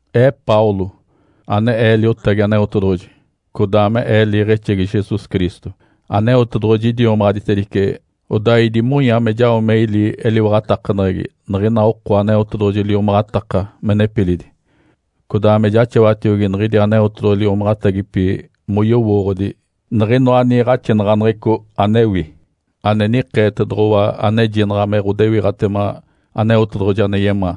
Ee Paulo, ane ee liotagi Aneotedoɡ̶oji, codaa me ee liiɡ̶exegi Jesus Cristo. Aneotedoɡ̶oji idiomaɡ̶aditedice, odaa idimonya me jao me ili eliwaɡ̶atakaneɡ̶egi niɡ̶ina oko Aneotedoɡ̶oji liomaɡ̶ataka me nepilidi, codaa me jaxawatiogi niɡ̶idi Aneotedoɡ̶oji liomaɡ̶atagipi moyowooɡ̶odi niɡ̶inoa niiɡ̶axinaɡ̶aneɡ̶eco anewi, ane nikeetoɡ̶owa anejinaɡ̶a me ɡ̶odewiɡ̶atema Aneotedoɡ̶oji ane yemaa.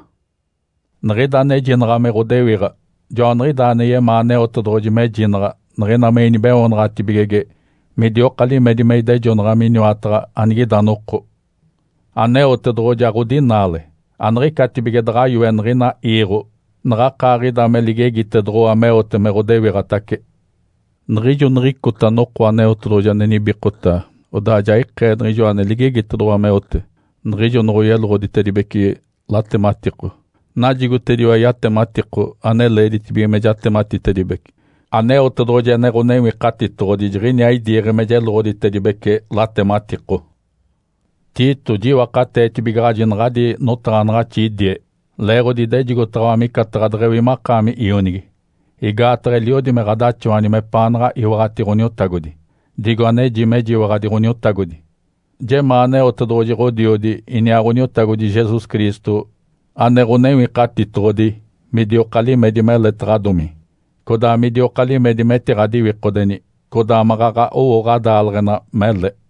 Niɡ̶ida anejinaɡ̶a me ɡ̶odewiɡ̶a joaniɡ̶idaa ane yemaa Aneotedoɡ̶oji mejinaɡ̶a niɡ̶ina me inibeoonaɡ̶atibigege midioka limedi me idejonaɡ̶a miniwataɡ̶a anigida noko. Aneotedoɡ̶oji aɡ̶odinaale. Aniɡ̶icatibige daɡ̶a yoe niɡ̶ina iiɡ̶o naɡ̶akaaɡ̶ida me ligegitedoɡ̶owa meote me ɡ̶odewiɡ̶atace. Niɡ̶ijo niɡ̶icota noko Aneotedoɡ̶oji ane nibikota, odaa ja ikee niɡ̶ijo ane ligegitedoɡ̶owa meote, niɡ̶ijo noɡ̶oyeloɡ̶oditedibece latematiko. Najigotediwa yatematiko ane leeditibige me jatematitedibece. Aneotedoɡ̶oji ane Ǥonewikatitoɡ̶odi jiɡ̶iniaa idiiɡ̶e me jeloɡ̶oditedibece latematiko. Tito, jiwakateetibigaɡ̶aji naɡ̶adi notaɡ̶anaɡ̶axi idie, leeɡ̶odi idejigotaɡ̶awa micataɡ̶a deɡ̶ewi makaami ionigi, igaataɡ̶a eliodi me ɡ̶adaxawani mepaanaɡ̶a iwaɡ̶ati Ǥoniotagodi, digo aneji mejiwaɡ̶adi Ǥoniotagodi. Jemaa Aneotedoɡ̶oji Ǥodiodi iniaa Ǥoniotagodi Jesus Cristo ane Ǥonewikatitoɡ̶odi midioka limedi meletaɡ̶adomi, codaa midioka limedi metiɡ̶adiwikodeni, codaa maɡ̶aɡ̶a owo ɡ̶adaaleɡ̶ena mele.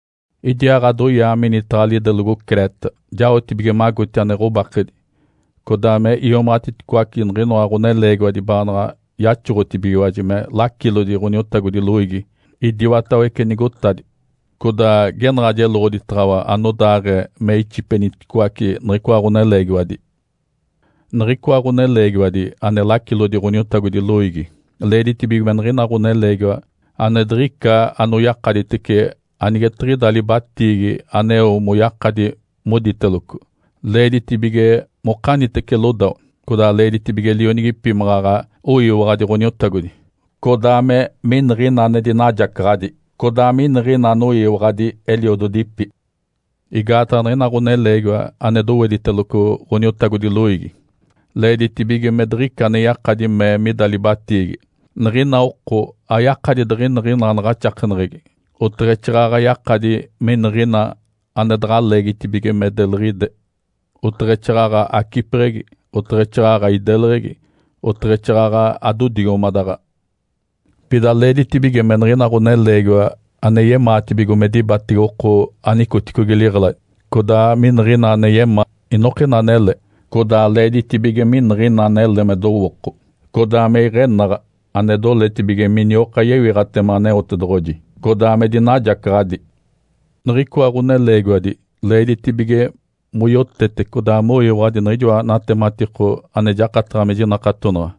Idiaaɡ̶adoyaa minitaɡ̶a lidelogo Creta jaotibige magoti ane ɡ̶obakedi, codaa me iomaɡ̶atiticoace niɡ̶inoa ɡ̶oneleegiwadi baanaɡ̶a yaxoɡ̶otibigiwaji me lacilodi Ǥoniotagodi loiigi idiwatawece nigotadi. Codaa genaɡ̶a jeloɡ̶oditaɡ̶awa anodaaɡ̶ee me ixipeniticoace niɡ̶icoa ɡ̶oneleegiwadi. Niɡ̶icoa ɡ̶oneleegiwadi ane lacilo Ǥoniotagodi loiigi leeditibige me niɡ̶ina ɡ̶oneleegiwa ane diɡ̶ica anoyakaditece anigetiɡ̶ida libatiigi aneo moyakadi moditeloco. Leeditibige mokanitece lodawa, codaa leeditibige lionigipi maɡ̶aɡ̶a oyiwaɡ̶adi Ǥoniotagodi, codaa me miniɡ̶ina ane dinajacaɡ̶adi, codaa miniɡ̶ina anoyiwaɡ̶adi eliododipi. Igaataɡ̶a niɡ̶ina ɡ̶oneleegiwa ane dowediteloco Ǥoniotagodi loiigi leeditibige me diɡ̶ica ane yakadi mee mida libatiigi. Niɡ̶ina oko ayakadi diɡ̶iniɡ̶ina anaɡ̶axakeneɡ̶egi, oteɡ̶exaaɡ̶aɡ̶a yakadi miniɡ̶ina ane daɡ̶a leegitibige me deliɡ̶ide, oteɡ̶exaaɡ̶aɡ̶a acipeɡ̶egi, oteɡ̶exaaɡ̶aɡ̶a ideleɡ̶egi, oteɡ̶exaaɡ̶aɡ̶a adodigomadaɡ̶a. Pida leeditibige me niɡ̶ina ɡ̶oneleegiwa ane yemaatibigo me dibatege oko anicoticogi liɡ̶eladi, codaa miniɡ̶ina ane yemaa inokina anele, codaa leeditibige miniɡ̶ina anele me dowooko, codaa me iɡ̶enaɡ̶a, ane doletibige minioka yewiɡ̶atema Aneotedoɡ̶oji, codaa me dinajacaɡ̶adi. Niɡ̶icoa ɡ̶oneleegiwadi leeditibige moyotete codaa moyiwaɡ̶adi niɡ̶ijoa natematiko ane jakataɡ̶a me jinakatonaɡ̶a,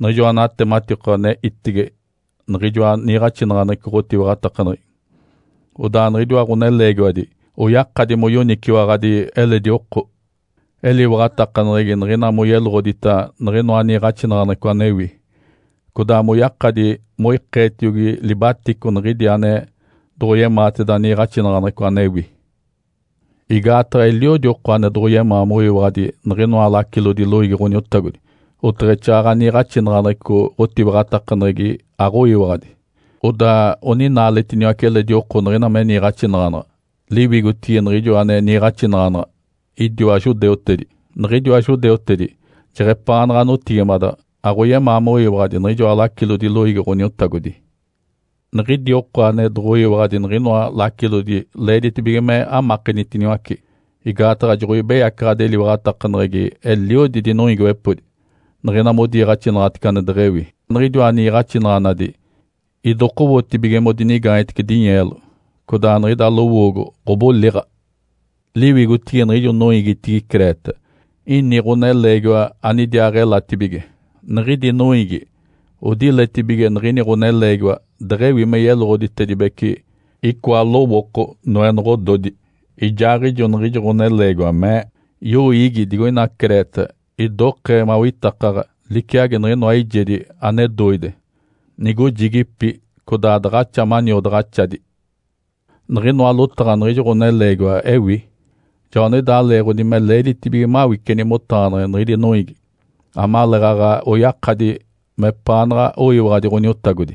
niɡ̶ijoa natematiko ane itege niɡ̶ijoa niiɡ̶axinaɡ̶aneɡ̶eco ɡ̶otiwaɡ̶atakaneɡ̶egi. Odaa niɡ̶idiwa ɡ̶oneleegiwadi oyakadi moyoniciwaɡ̶adi eledi oko eliwaɡ̶atakaneɡ̶egi niɡ̶ina moyeloɡ̶odita niɡ̶inoa niiɡ̶axinaɡ̶aneɡ̶eco anewi, codaa moyakadi moikeetiogi libatico niɡ̶idi ane doɡ̶oyemaateda niiɡ̶axinaɡ̶aneɡ̶eco anewi. Igaataɡ̶a eliodi oko ane doɡ̶oyemaa moyiwaɡ̶adi niɡ̶inoa lacilodi loiigi Ǥoniotagodi, oteɡ̶exaaɡ̶aɡ̶a niiɡ̶axinaɡ̶aneɡ̶eco ɡ̶otiwaɡ̶atakaneɡ̶egi aɡ̶oyiwaɡ̶adi. Odaa oninaaletiniwace eledi oko niɡ̶ina me niiɡ̶axinaɡ̶anaɡ̶a. Liwigotigi niɡ̶ijo ane niiɡ̶axinaɡ̶anaɡ̶a idiwa judeutedi. Niɡ̶idiwa judeutedi jeɡ̶epaanaɡ̶a notigimadaɡ̶a aɡ̶oyemaa moyiwaɡ̶adi niɡ̶ijoa lacilodi loiigi Ǥoniotagodi. Niɡ̶idi oko ane doɡ̶oyiwaɡ̶adi niɡ̶inoa lacilodi leeditibige me amakenitiniwace, igaataɡ̶a joɡ̶oibeyacaɡ̶adi eliwaɡ̶atakaneɡ̶egi eliodi dinoiigiwepodi niɡ̶ina modiiɡ̶axinaɡ̶atece ane deɡ̶ewi. Niɡ̶idiwa niiɡ̶axinaɡ̶anadi idokowotibige modinigaanyetece dinyeelo, codaa niɡ̶ida lowoogo ɡ̶oboliɡ̶a. Liwigotigi niɡ̶ijo noiigitigi Creta, ini ɡ̶oneleegiwa anidiaaɡ̶elatibige. Niɡ̶idi noiigi odiletibige niɡ̶ini ɡ̶oneleegiwa deɡ̶ewi me yeloɡ̶oditedibece icoa lowooko noenoɡ̶ododi. Ijaaɡ̶ijo niɡ̶ijo ɡ̶oneleegiwa mee, “Yoiigi digoina Creta idokee mawitakaɡ̶a, liciagi niɡ̶inoa eijedi ane doide, nigojigipi codaa daɡ̶axa maniodaɡ̶axadi.” Niɡ̶inoa lotaɡ̶a niɡ̶ijo ɡ̶oneleegiwa ewi. Joaniɡ̶idaa leeɡ̶odi me leeditibige mawiceni motaɡ̶aneɡ̶eni niɡ̶idi noiigi, amaleeɡ̶aɡ̶a oyakadi mepaanaɡ̶a oyiwaɡ̶adi Ǥoniotagodi.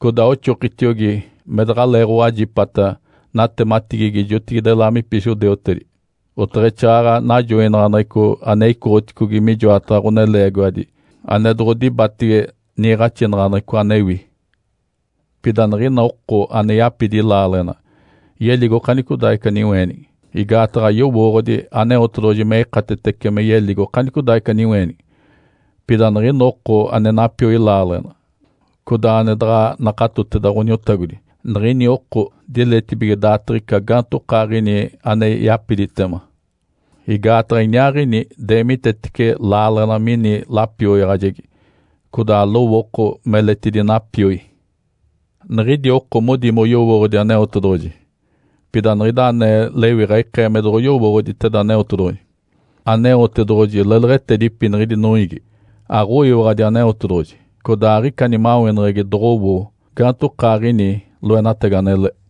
Codaa oxokitiogi me daɡ̶aleeɡ̶owajipata natematigigi jotigide laamipi judeutedi, oteɡ̶exaaɡ̶aɡ̶a najoinaɡ̶aneɡ̶eco ane icoɡ̶oticogi mijoataɡ̶a ɡ̶oneleegiwadi ane doɡ̶odibatege niiɡ̶axinaɡ̶aneɡ̶eco anewi. Pida niɡ̶ina oko ane yapidi laaleɡ̶ena yeligo okanicodaaɡ̶ica niweenigi, igaataɡ̶a yowooɡ̶odi Aneotedoɡ̶oji me ikatetece me yeligo okanicodaaɡ̶ica niweenigi. Pida niɡ̶ina oko ane napioi laaleɡ̶ena, codaa ane daɡ̶a nakatoteda Ǥoniotagodi, niɡ̶ini oko diletibige daatiɡ̶ica gaantokaaɡ̶ini ane yapiditema. Igaataɡ̶a iniaaɡ̶ini deemitetece laaleɡ̶ena mini lapioyaɡ̶ajegi, codaa lowooko meletidi napioi. Niɡ̶idi oko modi moyowooɡ̶odi Aneotedoɡ̶oji, pida niɡ̶ida anee lewiɡ̶a ikee me doɡ̶oyowooɡ̶oditeda Aneotedoɡ̶oji. Aneotedoɡ̶oji leleɡ̶etedipi niɡ̶idi noiigi. Aɡ̶oyiwaɡ̶adi Aneotedoɡ̶oji, codaa aɡ̶ica nimaweneɡ̶egi doɡ̶owo gaantokaaɡ̶ini loenatagi anele.